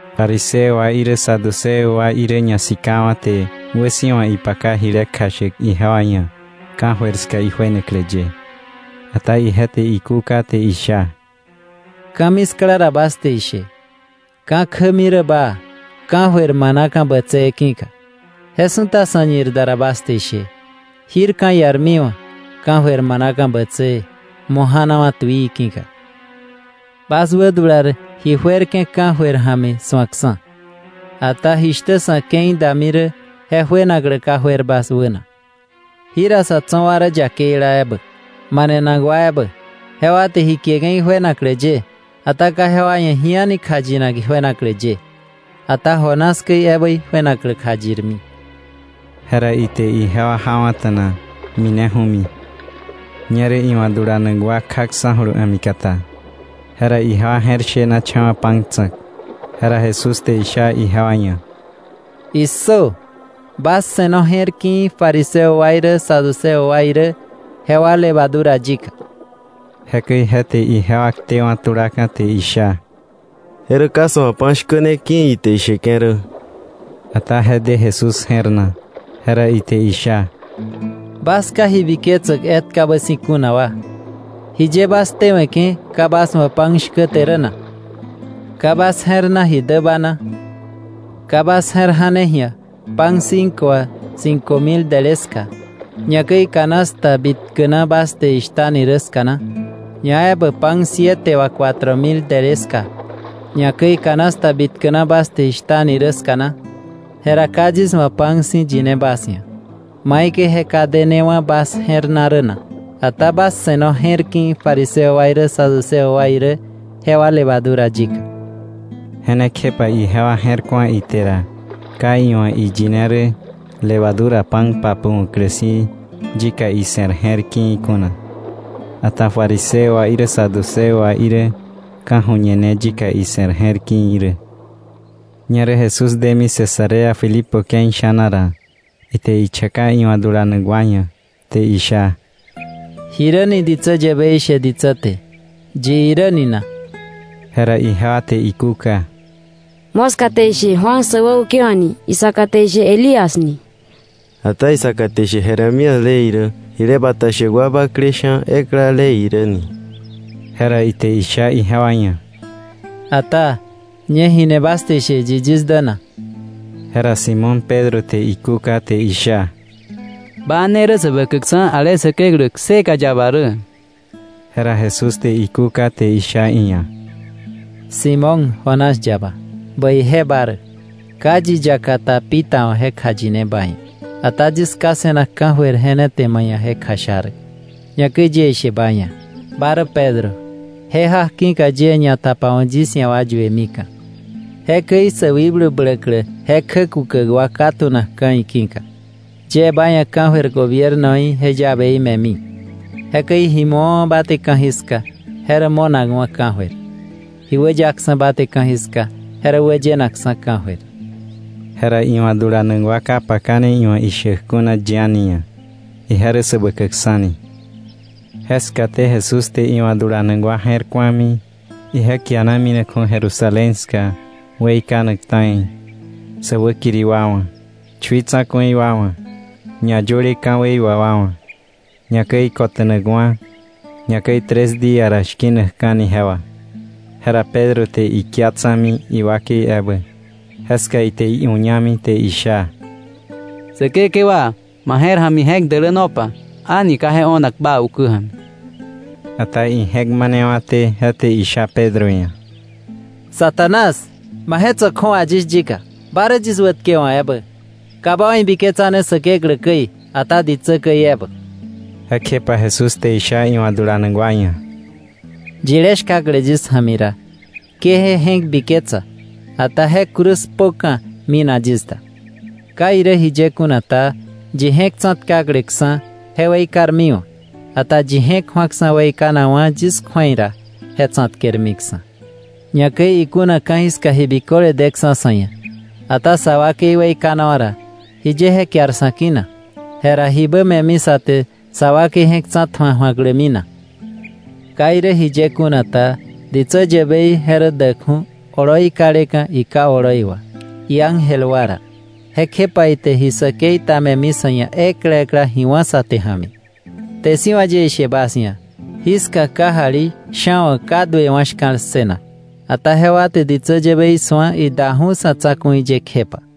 Fariseo wa irä Saduceo wa irä, ñasikawa̱ te wäsi̱wa ipaka jile kjashäk ijewa ia̱ ka̱jöir ska ijuenaklä ye. Ata ije te ikúka te isha: “Ka̱miskla ra bas te ishe: ‘Ka̱ kjämi rä baa, ka̱jöir manaka̱ bätsëë ki̱ka,’ je su̱ta sa̱ñir da ra bas te ishe: ‘Jir ka̱ iarmiwa̱, ka̱jöir manaka̱ bätsëë, mo̱ janawa̱ tuii ki̱ka.’ Bas wädular ji juerke̱ ka̱jöir ja̱mi su̱akksa̱, ata jishtä sa̱ ke̱i dami rä je juenaklä ka juer bas wäna. Jira sa̱ tso̱ wa rä yakeila ebä, manenak wa ebä, jewa te ji kieke̱ ijuenaklä ye. Ata ka jewa ia̱ ji a̱ni kjayinak ijuenaklä ye, ata Jonás käi ebä ijuenaklä kjayirmi.” Jera ite ijewa jawa̱ta̱na, mineju̱mi. Ñerä iwa̱ dulanak wa kjaksa̱julu a̱mikata, jera ijewa je̱r shenacha̱wa̱ pan tsa̱k. Jera Jesús te isha ijewa ia̱: —¡Issö! Bas se̱no je̱r ki̱i̱ fariseo wa irä Saduceo wa irä jewa levadura yika. Jekäi je te ijewa ktewa̱ tulaka̱ te isha: —¡Je rä ka sa̱ wa̱ pan shkä ne ki̱ ite isheke̱ rä! Ata je de Jesús je̱r na, jera ite isha: —Bas ka ji biketsäk etkabä si̱ kuna wa, ¿jiye bas ktewe̱ke̱ ka bas wa̱ pan shkä te rä na? ¿Ka bas je̱r na ji däba na? ¿Ka bas je̱r ja̱ne ji̱a pan cinco wà cinco mil dele ska, ñakäi canasta bitkä na bas te ishtani rä ska na? ¿Ñaebä pan siete wà cuatro mil dele ska, ñakäi canasta bitkä na bas te ishtani rä ska na? Jera ka yis wa̱ pan si̱ yine bas ia̱, ¿maikäi je ka denewa̱ bas je̱r na rä na? Ata bas se̱no je̱r ki̱i̱ fariseo wa irä Saduceo wa irä jewa levadura yika. Je ne kjepa ijewa je̱r ku̱a ite ra ka iwa̱ iyine rä levadura pan papu̱wa̱klä si̱ yika ise̱r je̱r ki̱i̱ kuna, ata fariseo wa irä saduceo wa irä ka̱ju̱ñe ne yika ise̱r je̱r ki̱i̱ rä. Ñerä Jesús demi Cesarea Filipo ke̱i sha̱na ra, ite ichaka iwa̱ dulanak wa ia̱, te isha: —¿Jiräni ditsä yäbei she ditsä te, yi iräni na? Jera ijewa te ikúka: —Moska te ishe Juan säwäukewa̱k ni; isaka te ishe Elías ni; ata isaka te ishe Jeremías le irä, jile bata shäk wa bakle sha̱ ekla le irä ni. Jera ite isha ijewa ia̱: —Ata ¿ñe jini bas te ishe, yi yis dä na? Jera Simón Pedro te ikúka, te isha: —Ba ne rä Säbäkäkksa̱, ale Säkeklä kseka yaba rä. Jera Jesús te ikúka, te isha iia̱: —Simón, Jonás yaba, bäije ba rä, ka yi yakata pita wa̱ je kjayine ba ia̱, ata yis Ká se̱nak ka̱jöir je ne te ma ia̱ je kjasha rä. Ñakäi yie ishe ba ia̱: Ba rä Pedro, je jak ki̱ka yie ñatapawa̱k yis ia̱ wa yuemika̱. Jekäi sä wikblu bläklä je kjäshtäklä ka tu̱nakka̱ iki̱ka. Yie ba ia̱ ka̱jöir gobiernoí je llaveí me̱mi. Jekäi ji mu̱awa̱ ba te ka̱jiska je rä mo̱nakwa̱ ka̱jöir; ji wäyaksa̱ ba te ka̱jiska, je rä wäyenakksa̱ ka̱jöir. Jera iwa̱ dulanak wa ka pakane iwa̱ ishäk kuna yi a̱ni ia̱, ije rä Säbäkäkksa̱ ni. Je skaté Jesús te iwa̱ dulanak wa je̱r ku̱ami ije kiana minakju̱ Jerusalén ska weikanak ta̱i, sä wäkiri wa wa̱, chui tsa̱ku̱i wa wa̱, ñayöle ka̱wei wà wa wa̱, ñakäi kota̱nakwa̱, ñakäi tres día ra shki̱nakka̱ni je wà. Jera Pedro te ikia tsa̱mi iwakei ebä, jeska ite iuñami, te isha: —Säkekewa, ma je̱r ja̱mi je̱k dälänopa. ¡A̱ni ka je o̱nak bä ukä ja̱mi! Ata ije̱k manewa̱té, je te isha Pedro ia̱: —Satanás, ma je̱k tso̱ kju̱awa yis yika, ba rä yis wätkewa̱k ebä. Ka ba wa̱ ibiketsane Säkeklä käi, ata ditsä käi ebä. Jekjepa Jesús te isha iwa̱ dulanak wa ia̱: —Yilé shkakle yis ja̱mi ra, ke je je̱k biketsa, ata je cruz kpöka̱, minak yis da. Ka irä jiye kuna ta, yi je̱k tsa̱tkakleksa̱, je weikarmiwa̱. Ata yi je̱k ju̱aksa̱ weikanakwa̱ yis kju̱ei ra, je tsa̱tkermiksa̱. Ñakäi ikuna ka̱jiska ji biköle deksa̱ sa̱ ia̱, ata sa wakei weikanawa̱ ra, ¿jiye je kiar sa̱ ki̱ na? Jera ¿jibä me̱mi sa te sa wakei je̱k tsa̱tju̱a ju̱aklämi na? Ka irä jiye kuna ta, ditsä yäbei je rä däkju̱ oloi kaleka̱ iKá oloi wà, iángel wa ra. Jekjepa ite ji säkei me̱mi sa̱ ia̱ ekla ekla ji wá̱ sä te ja̱mi. Kte si̱ wà yie ishe bas ia̱, jiska kajali sha̱ wa̱ ka duewa̱ shka̱l ssënak, ata jewa te ditsä yäbei su̱a idaju̱ sa̱ tsa̱ku̱i ye kjepa.